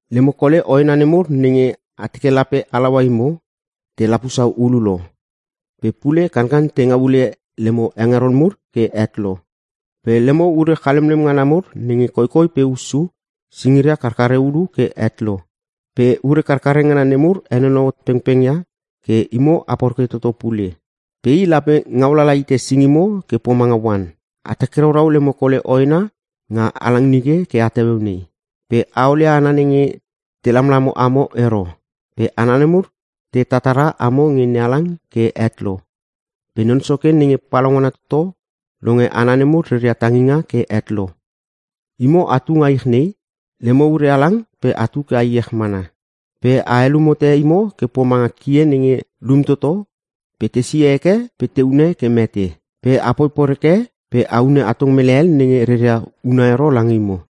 Lemo kole hoena nemur nenge a teke lape halaua imo, te lapusa hulu lo. Pe pule kankan te ngau ule lemo hengeron mur ke het lo. Pe lemo ure chalemlem ngana mur nenge koikoi pe hussu, singiria karkare ulu ke het lo. Pe ure karkare ngana nemur henonou hot pengpengia ke imo a poreke toto pule. Pe i lape ngau lala hite singimo ke pomanga oan. A takiraurau lemo kole hoena nga halang nike ke at heueu nei. Pe a olia hana nenge te lamlamo amo ero. Pe hana nemur te tatara amo nge NeHalang ke het lo. Pe Non Soke Nenge Palaungana Toto longe hana nemur reria tanginga ke het lo. Imo atu nga ich nei, lemo ure halang pe atu ke a iech mana. Pe a helum hote imo ke pomanga kie nenge lum toto pe tesie heke pe te hune ke mete. Pe apoi poreke pe a hune atong mele hel nenge reria huna ero lange imo.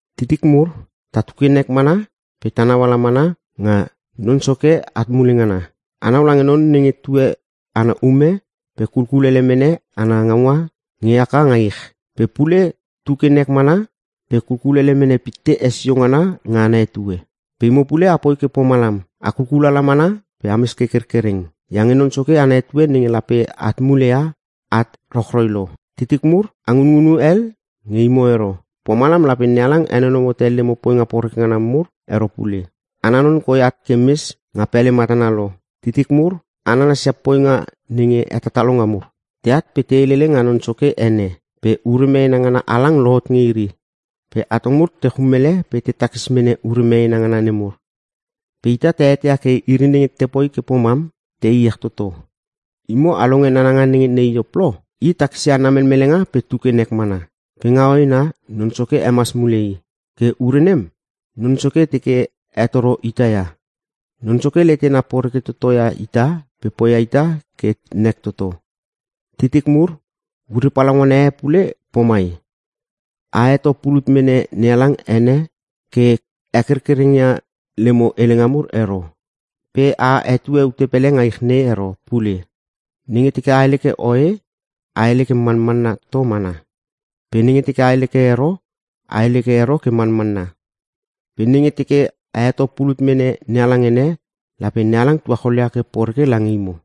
Titik mur, tatu ke nek mana pe ta nau ala mana nga Non Soke at mule ngana. Anau lange non nenge tue ana ume pe kulkulele mene ana ngaunga nge haka nga ich. Pe pule tu ke nek mana pe kulele mene pitte hesio ngana nga ana etue. Pe imo pule a poi ke pomalam. A kulkulala mana pe ames ke kerkereng, iange Non Soke ana etue nenge lape at muleia, at rochroi lo. Titik mur, a ngunngunu hel nge imo ero, pomalam lape NeHalang henonou hote lemo poinga poreke ngana mur ero pule. Ana non koi at ke mes nga pele matana lo! Titik mur, a nanasia poinga nenge hetatalonga mur. Teat pe te helele nga Non Soke ene, pe ure meena ngana halang lohot nge iri. Pe atong mur te chum ele pe te takis mene ure meena ngana nemur. Pe ita ta eteia ke iri nenge te poi ke pomam, te iech toto. Imo a longe nananga nenge ne Iop lo? I takisia ana melmelenga pe tu ke nek mana. Pe nga hoena, Non Soke hemas mule i. Ke ure nem, Non Soke teke hetoro ita ia. Non Soke letena poreke toto ia ita pe poia ita ke nek toto. Titik mur, ure palaungana e pule pomai. A heto pulut mene NeHalang ene ke hekerkereng ia lemo helenga mur ero. Pe a hetue ute pele nga ich nei ero pule. Nenge teke a hele ke oe, a hele ke manmanna toto mana. Pe nenge teke a hele ke ero, a hele ke ero ke manmanna. Pe nenge teke a heto pulut mene NeHalang ene, lape NeHalang tuachol ia ke poreke lange imo.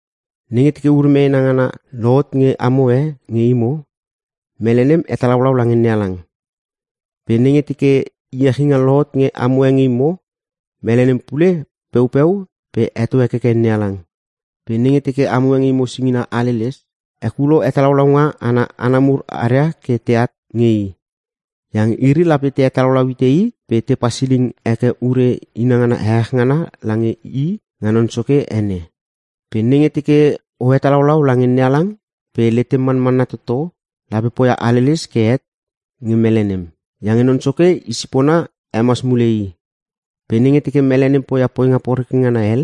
Nenge teke ure meena ngana lohot nge amo e nge imo, mele nem hetalaulau lange NeHalang. Pe nenge teke iechinga lohot nge amo e nge imo, mele nem pule peupeu pe heto hekekeke NeHalang. Pe nenge teke amo e nge imo singina aleles, hekulo hetalaulaunga ana hana mur aria ke teat nge i. Iange iri lape te hetalaulau hite i pe te pasiling heke ure inangana ehech ngana lange i nga Non Soke ene. Pe nenge teke o hetalaulau lange NeHalang pe letem manmanna toto, lape poia haleles ke het nge mele nem. Iange Non Soke i sipona hemas mule i. Pe nenge teke mele nem poia poinga poreke ngana hel,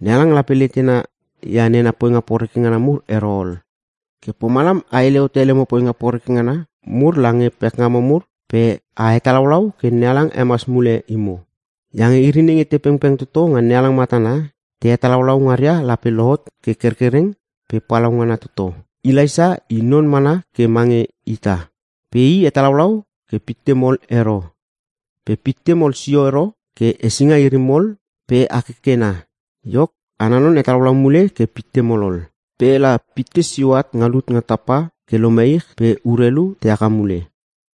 NeHalang lape letena ia nena poinga poreke ngana mur ero ol. Ke pomalam a hele hote lemo poinga poreke ngana mur lange pekngamo mur pe a hetalaulau ke NeHalang hemas mule imo. Iange iri nenge te pengpeng toto nga NeHalang matana, te hetalaulau ngaria lape lohot ke kerkereng pe palaungana toto. Elaisa i non mana ke mange ita. Pe i hetalaulau ke pitte mol ero. Pe pitte mol sio ero ke hesinga iri mol pe hakekena. Iok, ana non hetalaulau mule ke pitte mol ol. Pe la pitte sio at nga lut nga tapa ke lome ich pe urelu te haka mule.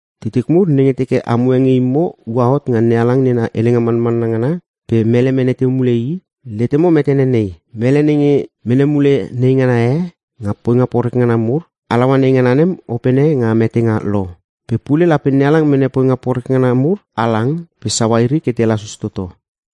Titik mur nenge teke amo e nge imo ua hot nga NeHalang na helenga manmanna ngana pe mele mene teu mule i, letemo metene nei: Mele nenge mene mule neingana e nga poinga poreke ngana mur, halaua neingana nem opene nga metenga lo. Pe pule, lape NeHalang mene poinga poreke ngana mur halang pe saua iri ke te lasus toto.